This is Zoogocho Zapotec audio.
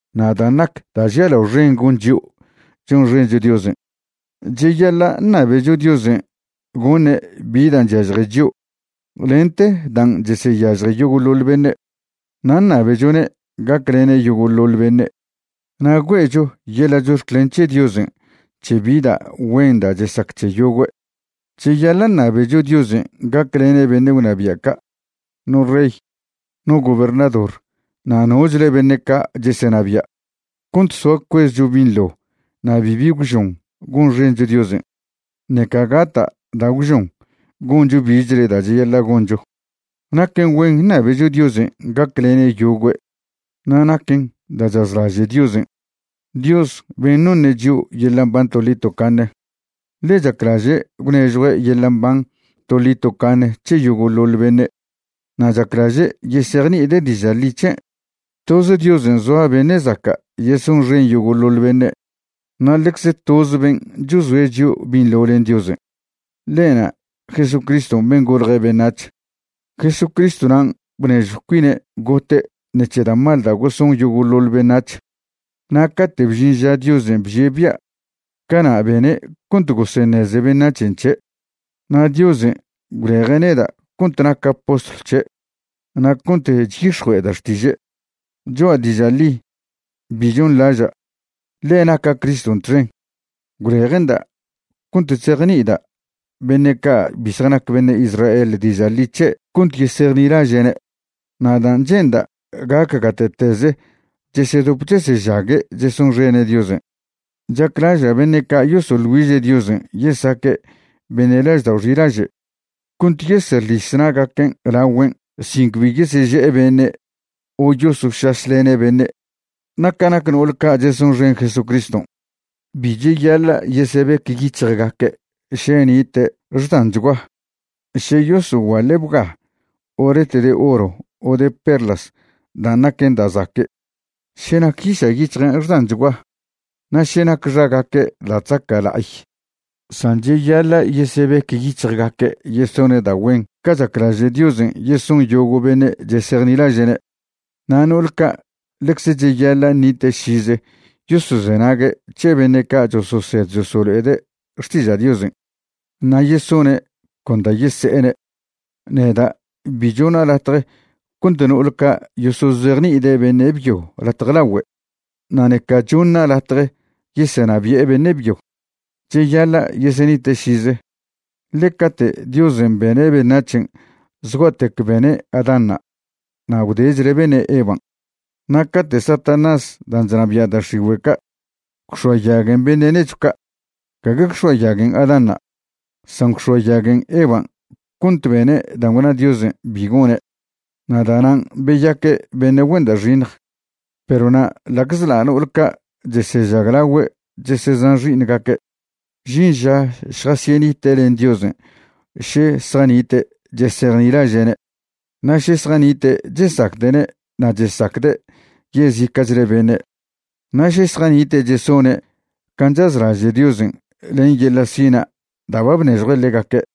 Na' dan' nac da' žialao xen gon chio' chonxencho Diosen': cheyaḻa' ṉabecho Diosen' goṉe' bi dan' chyažje chio' lente dan' cheseyažje yogo'ḻoḻ beṉe', na' ṉabechone' gaclene' yogo'ḻoḻ beṉe', na' güe'cho yeḻa' chox̱clen c̱he Diosen' c̱he bi da' güen da' chesac c̱he yogüe'. Cheyaḻa' ṉabecho Diosen' gaclene' beṉe' gwnabia' ca', no rey, no gobernador na' nochle beṉe' ca' chesenabia', cont soa cuezcho binḻo na' bibi gwžon gonxencho Diosen', ṉeca gata' da' gwžon goncho bichle da' cheyaḻa' goncho. Naquen güen ṉabecho Diosen' gaclene' yogüe' na' naquen da' chazlaže' Diosen', Dios ben' noṉe' chio' yeḻa' mban toḻi tocaṉe. Ḻe chaclaže' gwnežjue' yeḻa' mban toḻi tocaṉe c̱he yogo'ḻoḻ beṉe' na' chaclaže' yesejni'ide' diža' ḻi c̱he'. Toz Diosen' zoa beṉe' zaca' yesonxen yogo'ḻoḻ beṉe', na' ḻecz toz ben' chozoe' chio' binḻo len Diosen', ḻe'na' Jesucriston' ben' golje beṉac̱h. Jesucristw nan' bnežjw cuine' gote' ṉec̱he da' mal da' goson yogo'ḻoḻ beṉac̱h, na' cate' bžin ža Diosen' bžie' bia', cana' bene' cont goseṉeze beṉac̱hen' c̱he'. Na' Diosen' gwleje' neda' cont naca' postlw c̱he' na' cont chyix̱jue'eda' xtiže'. Choa' diža' ḻi, bi chonḻaža', ḻe naca' Criston' txen, gwleje'nda' cont chzejni'ida' beṉe' ca' bi zjanac beṉe' Israel diža' ḻi c̱he' cont yesejnilaže'ne'. Na' dan' che'nda' gac gate'teze chesedop chesežague' chesonxene' Diosen', chaclaža' beṉe' ca' yosoḻ güiže' Diosen' yesaque' beṉe' laždao' xilaže' cont yeseḻis na'gaquen' laogüen' sin cbi yeseže'e beṉe' o yosošašlene' beṉe'. Na' ca nac no'ol ca' chesonxen Jesucriston', bi cheyaḻa' yesebec yic̱hjgaque' še nite' xdanchgua, še yosoguaḻe' bga o ret de oro o de perlas dan' naquen da' zaque', še nac yiša' yic̱hjen' xdanchgua, na' še nac xagaque' da' chzaca' la'ay. San cheyaḻa' yesebec yic̱hjgaque' yesone' da' güen ca chaclaže' Diosen' yeson yogo' beṉe' chesejnilaže'ne'. Na' no'ol ca' ḻecze cheyaḻa' ṉite' šize yosozenague' c̱he beṉe' ca' chososed chosolo'ede' xtiža' Diosen', na' yesone' con da' yese'ene'. Neda' bi chona' latje cont no'ol ca' yosozejni'ide' beṉe' byo latje lagüe', na' ṉeca choṉa' latje yesenabi'e beṉe' byo. Cheyaḻa' yesenite' šize, ḻe cate' Diosen' bene' beṉac̱hen' zgua'tec bene' Adánṉa' na' gwdechle bene' Evan'. Na' cate' Satanás dan' chnabia' da' x̱igüe' ca' gwx̱oayaguen beṉe' nechw ca', gague gwx̱oayaguen Adánṉa', san gwx̱oayaguen Evan' cont bene' dan' gwna Diosen' bi gone', na' da'nan' beyaque' beṉe' güen da' xiṉj. Perw na' ḻa'czḻa' no'ol ca' chesežaglagüe' chesezan xi'iṉgaque', žin ža šjasyenite' len Diosen' še zjanite' chesejnilaže'ne' na' še zjanite' chesacde'ne' na' chesacde' yezica'chle beṉe', na' še zjanite' chesone' can' chazlaže' Diosen' len yeḻa' sina' da' ba bnežjue' ḻegaque'.